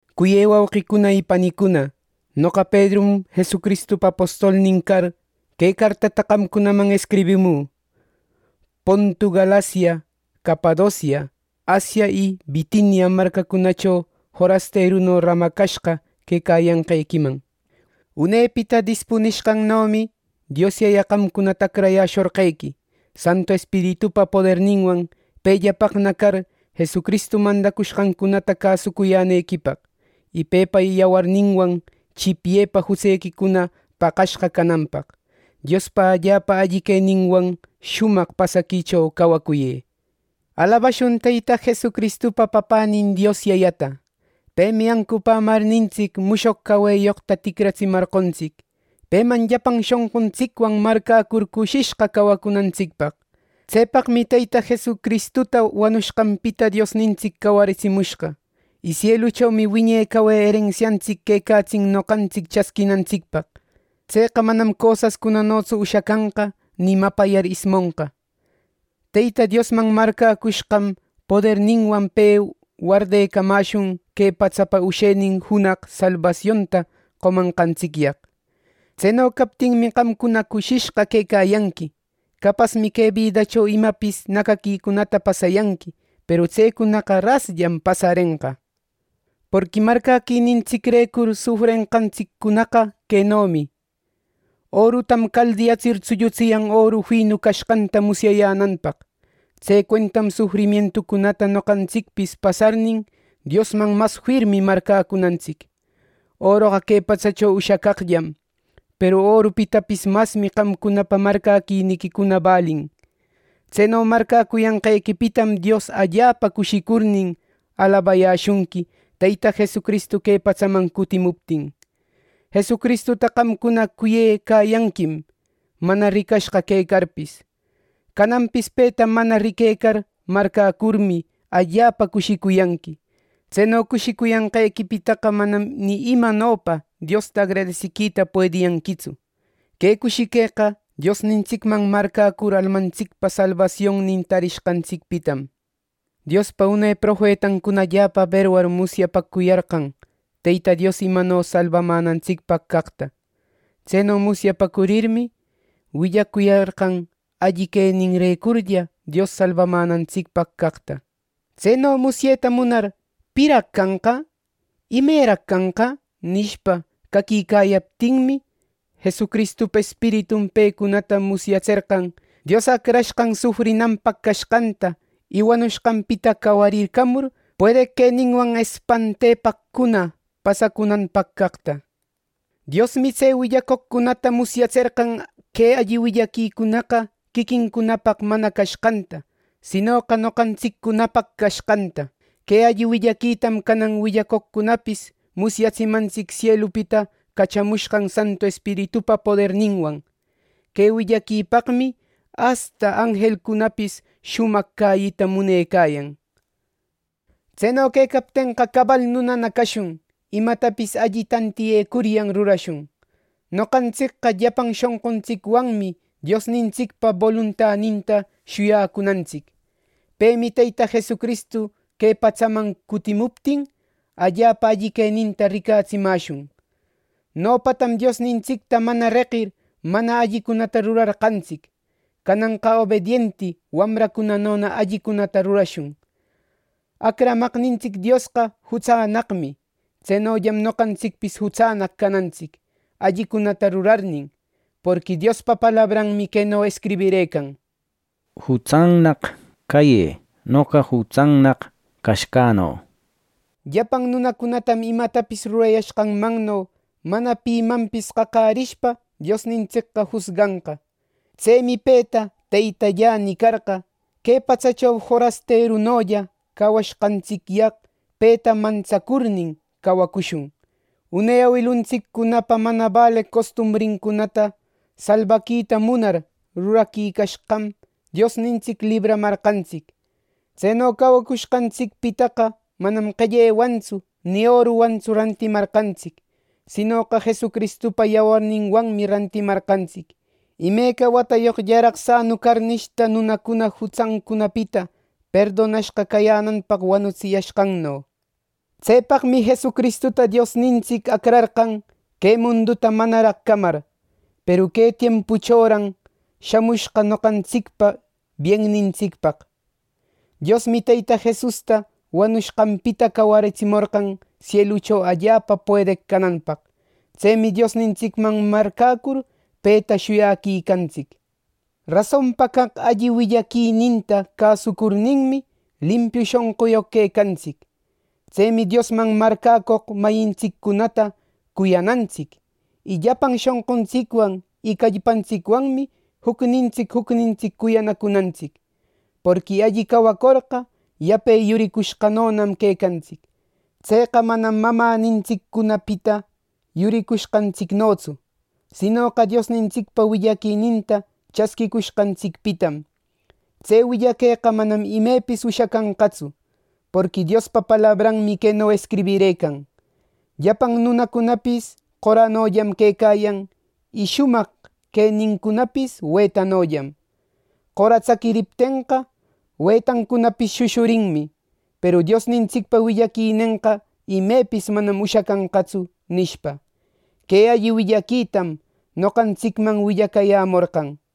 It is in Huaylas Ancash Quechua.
Cuyë wauqicuna y panicuna, noqa Pedrum, Jesucristupa apostolnin car, que cartata qamcunaman escribimü: Pontu, Galacia, Capadocia, Asia, y Bitinia marcacunacho forasteruno ramacashqa quecayanqequiman. Unepita dispunishqannomi Dios Yaya qamcunata acrayäshorqequi, Santu Espiritupa poderninwan pellapaqna car, Jesucristu mandacushqancunata cäsucuyänequipaq; y pepa yawarninwan chipyepa jutsequicuna paqashqa cananpaq. Diospa allapa alli queninwan shumaq pasaquicho cawacuyë. ¡Alabashun Teyta Jesucristupa Papänin Dios Yayata! Pemi ancupämarnintsic, mushoq caweyoqta ticraratsimarqontsic, peman llapan shonquntsicwan marcäcur cushishqa cawacunantsicpaq. Tsepaqmi Teyta Jesucristuta wanushqanpita Diosnintsic cawaritsimushqa. Y sieluchomi wiñe cawe erensiantsic quecatsin noqantsic chasquinantsicpaq. Tseqa manam cosascunanotsu ushacanqa, ni mapayar ismonqa. Teyta Diosman marcäcushqam poderninwan pe wardecamäshun que patsapa ushenin junaq salbasionta qomanqantsicyaq. Tseno captinmi, qamcuna cushishqa quecayanqui. Capasmi que bidacho imapis nacaquicunata pasayanqui, peru tsecunaqa rasllam pasarenqa. Porqui marcäquinintsicrecur sufrenqantsiccunaqa quenomi: orutam caldiyatsir tsullutsiyan oru finu cashqanta musyayänanpaq. Tse cuentam sufrimientucunata noqantsicpis pasarnin, Diosman mas firmi marcäcunantsic. Oroqa que patsacho ushacaqllam. Peru orupitapis masmi qamcunapa marcäquiniquicuna balin. Tseno marcäcuyanqequipitam Dios allapa cushicurnin, alabayäshunqui Teyta Jesucristu que patsaman cutimuptin. Jesucristuta qamcuna cuyecayanquim, mana ricashqa quecarpis. Cananpis peta mana riquecar marcäcurmi, allapa cushicuyanqui. Tseno cushicuyanqequipitaqa manam ni imanopa Diosta agradesiquita puediyanquitsu. Que cushiqueqa: Diosnintsicman marcäcur almantsicpa salbasionnin tarishqantsicpitam. Diospa une profetancunam allapa aberwar musyapäcuyarqan Teyta Dios imanopa salbamänantsicpaq caqta. Tseno musyapäcurirmi, willacuyarqan alli queninrecurlla Dios salbamänantsicpaq caqta. Tseno musyeta munar “¿Piraq canqa? ¿Imeraq canqa?” nishpa, caquicayaptinmi, Jesucristupa Espiritun pecunata musyatserqan Dios Acrashqan sufrinanpaq cashqanta, y wanushqanpita cawarircamur, puedeq queninwan espantepaqcuna pasacunanpaq caqta. Diosmi tse willacoqcunata musyatserqan que alli willaquicunaqa quiquincunapaq mana cashqanta, sinoqa noqantsiccunapaq cashqanta. Que alli willaquitam canan willacoqcunapis musyatsimantsic sielupita cachamushqan Santu Espiritupa poderninwan. Que willaquipaqmi asta anjelcunapis shumaq cäyita munecayan. Tseno quecaptenqa, cabal nunana cashun; imatapis alli tantiyecuryan rurashun. Noqantsicqa llapan shonquntsicwanmi Diosnintsicpa boluntaninta shuyacunantsic. Pemi Teyta Jesucristu que patsaman cutimuptin, allapa alli queninta ricatsimäshun. Nopatam Diosnintsicta mana reqir, mana allicunata rurarqantsic; cananqa obedienti wamracunanona allicunata rurashun. Acramaqnintsic Diosqa jutsannaqmi. Tsenollam noqantsicpis jutsannaq canantsic, allicunata rurarnin; porqui Diospa palabranmi queno escribirëcan, “Jutsannaq cayë, noqa jutsannaq cashqäno”, nir. Llapan nunacunatam imatapis rurayashqanmanno mana pimanpis qaqärishpa Diosnintsicqa jusganqa. Tsemi peta “Teytallä” nicarqa, que patsacho forasterunolla cawashqantsicyaq peta mantsacurnin cawacushun. Une awiluntsiccunapa mana baleq costumbrincunata salbaquita munar ruraquicashqam Diosnintsic libramarqantsic. Tseno cawacushqantsicpitaqa manam qellewantsu ni oruwantsu rantimarqantsic. Sinoqa Jesucristupa yawarninwanmi rantimarqantsic, imeca watayoqllaraq sanu carnishta nunacuna jutsancunapita perdonashqa cayänanpaq wanutsiyashqanno. Tsepaqmi Jesucristuta Diosnintsic acrarqan, que munduta manaraq camar; peru que tiempuchoran shamushqa noqantsicpa biennintsicpaq. Diosmi Teyta Jesusta wanushqanpita cawaritsimorqan sielucho allapa puedeq cananpaq. Tsemi Diosnintsicman marcäcur, peta shuyaquicantsic. Rasonpa caq alli willaquininta cäsucurninmi, limpiu shonquyoq quecantsic. Tsemi Diosman marcäcoq mayintsiccunata cuyanantsic. Y llapan shonquntsicwan y callpantsicwanmi jucnintsic jucnintsic cuyanacunantsic. Porqui alli cawacorqa, yape yuricushqanonam quecantsic. Tseqa manam mamänintsiccunapita yuricushqantsicnotsu, sinoqa Diosnintsicpa willaquininta chasquïcushqantsicpitam. Tse willaqueqa manam imepis ushacanqatsu. Porqui Diospa palabranmi queno escribirëcan: “Llapan nunacunapis qoranollam quecayan, y shumaq quenincunapis wetanollam. Qora tsaquiriptenqa, wetancunapis shushurinmi; peru Diosnintsicpa willaquinenqa imepis manam ushacanqatsu”, nishpa. Que alli willaquitam noqantsicman willacayämorqan.